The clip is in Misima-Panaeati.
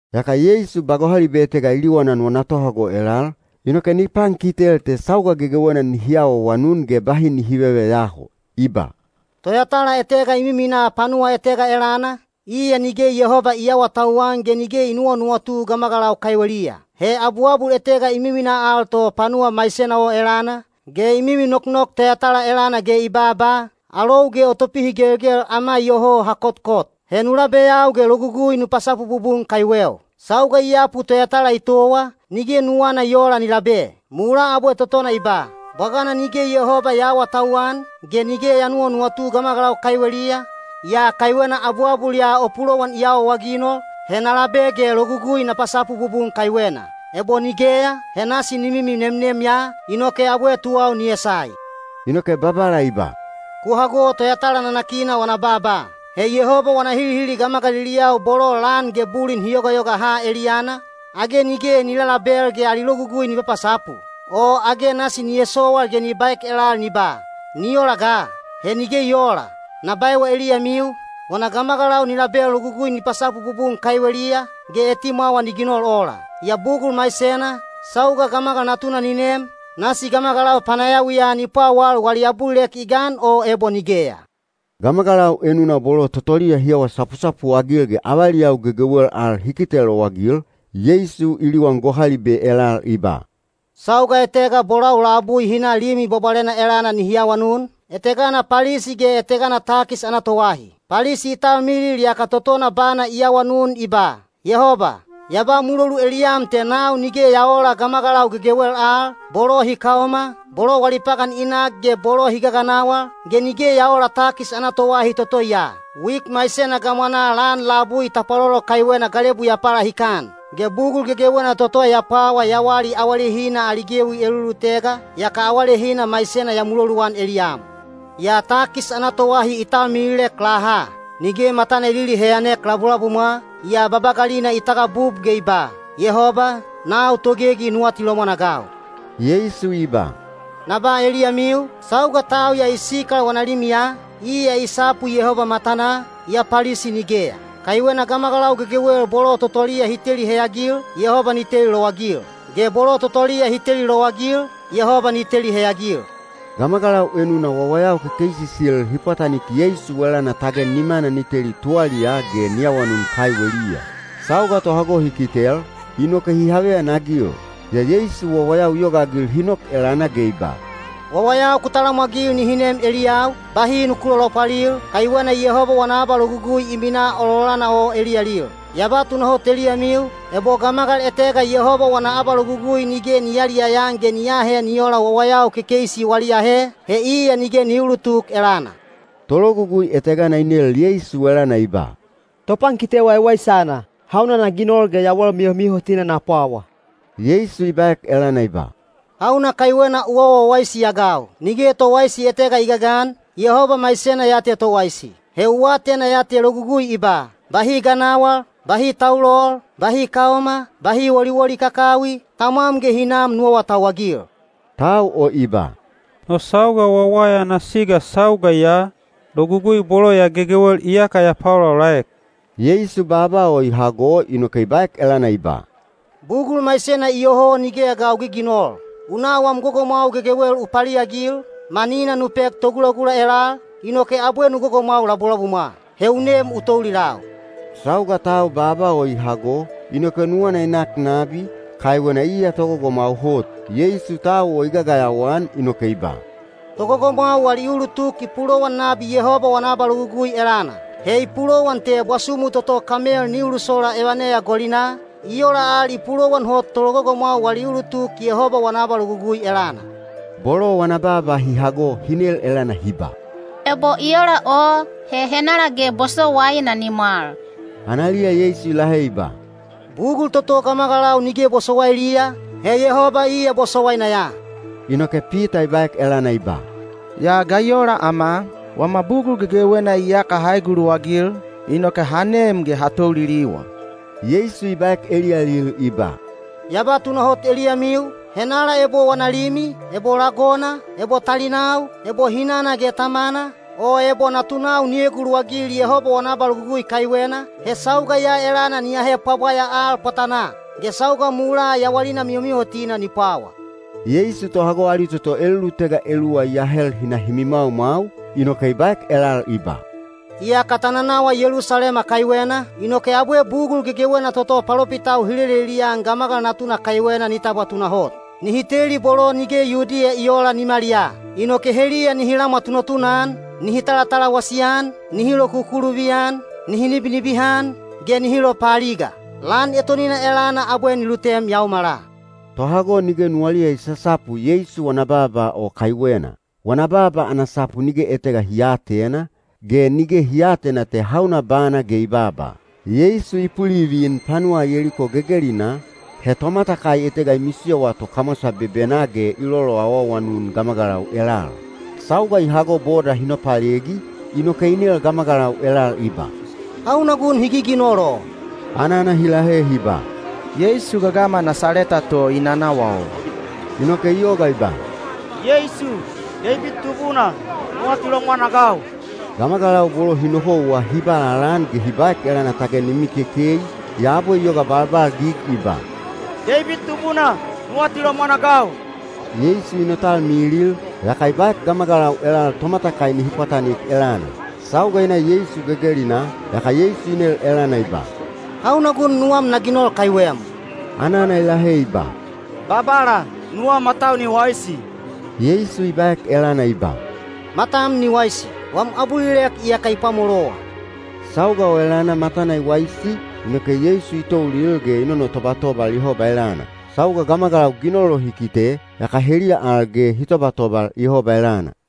Yaka Yeisu ba gohalibe etega i liwanan wana tohago elal, inoke ni pankitel te sauga gegewena nihi awaawanun ge bahi nihi veveyaho. I ba, “Toyatala etega i miminaa panuwa etega elana, iya nige Yehoba i aawatauwan ge nige i nuwanuwatu gamagalau kaiweliya. He abuabul etega i miminaa al to panuwa maisena o elana, ge i mimi noknok toyatala elana ge i babaa, ‘Alou ge o topihigelgel ama iyoho ha kotkot. He nu labeyau ge logugui nu pasapu bubun kaiweu.’ Sauga i yapu toyatala i towa, nige nuwana i oola ni labe. Mulaa abwe totona i ba, ‘Bwagana nige Yehoba ya aawatauwan, ge nige ya nuwanuwatu gamagalau kaiweliya, yaa kaiwena abuabul ya o pulowan i awaawaginol, he na labe ge logugui na pasapu bubun kaiwena. Ebo nigeya, he nasi ni mimi nemnem ya, inoke abwe tuwau ni esai.’” Inoke Babala i ba, “Ku hago toyatala nanakina wana baaba. He Yehoba wana hilihili gamagaliliyau bolo lan ge bulin hi yogayoga ha eliyana, age nige ni lalabel ge ali logugui ni papasapu? O age nasi ni esowal ge ni baek elal ni ba, ‘Ni ola ga!’? He nige i oola. Na baewa eliyamiu, wana gamagalau ni label logugui ni pasapu bubun kaiweliya, ge etimwawa ni ginol ola. Yaa bugul maisena, sauga Gamagal Natuna ni nem, nasi gamagalau panayawiya ni pwawal wali abulilek i gan o ebo nigeya?” Gamagalau enuna bolo totoliya hi awa sapusapu-agil ge avaliyau gegewel al hi kite lowagil, Yeisu i liwan gohalibe elal i ba, “Sauga etega bolau labui hi na Limi Bwabwalena elana nihi awanun, etegana Palisi ge etegana takis ana toahi. Palisi i talmilil yaka totona bana i awanun i ba, ‘Yehoba, ya ba mulolu eliyam te nau nige ya oola gamagalau gegewel al, bolo hi kaoma, bolo wali pagan i nak ge bolo hi gaganawal, ge nige ya oola takis ana toahi toto ya. Wik maisena gamwanaa lan labui tapwalolo kaiwena galebu ya palahikan. Ge bugul gegewena toto ya pwawa ya wali awalehina ali gewi elulutega, yaka awalehina maisena ya muloluan eliyam.’ “Yaa takis ana toahi i talmililek laha. Nige matana i liliheyanek labulabumwa, yaa babagalina i tagabub ge i ba, ‘Yehoba, nau togegi nu atilomwan-agau.’” Yeisu i ba, “Na ba eliyamiu, sauga tau ya i sikal wana limiya, iya i sapu Yehoba matanaa, yaa Palisi nigeya. Kaiwena gamagalau gegewel bolo totoliya hi teli heyagil, Yehoba ni teli lowagil, ge bolo totoliya hi teli lowagil, Yehoba ni teli heyagil.” Gamagalau enuna wawayau kekeisisil hi pwatanik Yeisu elana tage nimana ni teli tuwaliyaa ge ni awanun kaiweliya. Sauga tohago hi kitel, inoke hi haveyanagil. Yaa Yeisu wawayau i yogaagil hi nok elana ge i ba, “Wawayau ku talamwagil nihi nem eliyau, bahi nuku lolopwalil, kaiwena Yehoba wana abalogugui i minaa ololana o eliyalil. Ya ba tunahot eliyamiu, ebo gamagal etega Yehoba wana abalogugui nige ni yayaliyaya-an ge ni aahe ni oola wawayau kekeisi wali ahe, he iya nige ni uulutuk elana.” Tologugui etegana i nel Yeisu elana i ba, “Topankite waiwaisana, hauna na ginol ge yawal mihomihotina na pwawa?” Yeisu i baek elana i ba, “Hauna kaiwena u awa wawaisi-agau? Nige towaisi etega i gagan, Yehoba maisena ya te towaisi. He u atena ya te logugui i ba, ‘Bahi ganawal, bahi taulol, bahi kaoma, bahi woliwoli kakawi, tamwam ge hinam nu awatauwagil.’” Tau o i ba, “No sauga wawaya ana siga sauga ya, logugui bolo ya gegewel iyaka ya paolaolaek.” Yeisu baaba o i hago inoke i baek elana i ba, “Bugul maisena iyoho nigeya ga u giginol. U na wam gogomwau gegewel u paliagil, manina nu pek togulagula elal, inoke abwe nu gogomwau labulabumwa. He u nem u toulilau.” Sauga tau baaba o i hago, inoke nuwana i nak nabi, kaiwena iya togogomwau hot. Yeisu tau o i gagayawa-an inoke i ba, “Togogomwau wali ulutuk i pulowan nabi Yehoba wana abalogugui elana. He i pulowan te bwasumu toto kamel ni ulusola evaneya golinaa, i ola al i pulowan hot tologogomwau wali ulutuk Yehoba wana abalogugui elana.” Bolo wana baaba hi hago hi nel elana hi ba, “Ebo i ola o, he henala ge bosowaina ni mwal?” Analiya Yeisu i lahe i ba, “Bugul toto gamagalau nige bosowailiya, he Yehoba iya bosowaina ya.” Inoke Pita i baek elana i ba, “Yaa ga i ola ama? Wama bugul gegewena iyaka ha eguluwagil, inoke ha nem ge ha touliliwa.” Yeisu i baek eliyalil i ba, “Ya ba tunahot eliyamiu, henala ebo wana limi, ebo lagona, ebo talinau, ebo hinana ge tamana, o ebo natunau ni eguluwagil Yehoba wana abalogugui kaiwena, he sauga ya elana ni ahe pwabwaya al pwatanaa. Ge sauga mulaa yawalina mihomihotina ni pwawa.” Yeisu tohago ali toto elulutega eluwa i ahel hi na hi mimwaumwau, inoke i baek elal i ba, “Iyaka ta nanawa Yelusalema kaiwena, inoke abwe bugul gegewena toto palopitau hi lelelian Gamagal Natuna kaiwena ni tabwa tunahot. Nihi teli bolo nige Yudiya i oola nimaliyaa. Inoke heliya nihi lamwa tunatuna-an, nihi talatalawasi-an, nihi lokukuluvi-an, nihi nibinibihan, ge nihi lopaaliga. Lan etonina elana abwe ni lutem yaomala.” Tohago nige nuwaliya i sasapu Yeisu wana baaba o kaiwena. Wana baaba ana sapu nige etega hi aatena, ge nige hi aatena te hauna bana ge i baaba. Yeisu i pulivin panuwa Yeliko gegelinaa, he tomatakai etega i misiyowa to kamwasa bebenaa ge i loloawaawanun gamagalau elal. Sauga i hago boda hi nopalegi, inoke i nel gamagalau elal i ba, “Hauna gun hi giginol o?” Anana hi lahe hi ba, “Yeisu gagama Nasaleta to i nanawa o.” Inoke i yoga i ba, “Yeisu, Deibid Tubuna, nu atilomwan-agau!” Gamagalau bolo hi nohouwa hi ba lalaan ge hi baek elana tage ni mikekei, yaa abwe i yoga balbalgig i ba, “Deibid Tubuna, nu atilomwan-agau!” Yeisu i notalmilil, yaka i baek gamagalau elal tomatakai nihi pwatanik elana. Sauga i na Yeisu gegelinaa, yaka Yeisu i nel elana i ba, “Hauna gun nuwam na ginol kaiwem?” Anana i lahe i ba, “Babala, nuwau matau ni waisi.” Yeisu i baek elana i ba, “Matam ni waisi. Wam abulilek iyaka i pwamolowa.” Sauga o elana matana i waisi, inoke Yeisu i toulil ge i nonotobatobal Yehoba elana. Sauga gamagalau ginol o hi kite, yaka heliya al ge hi tobatobal Yehoba elana.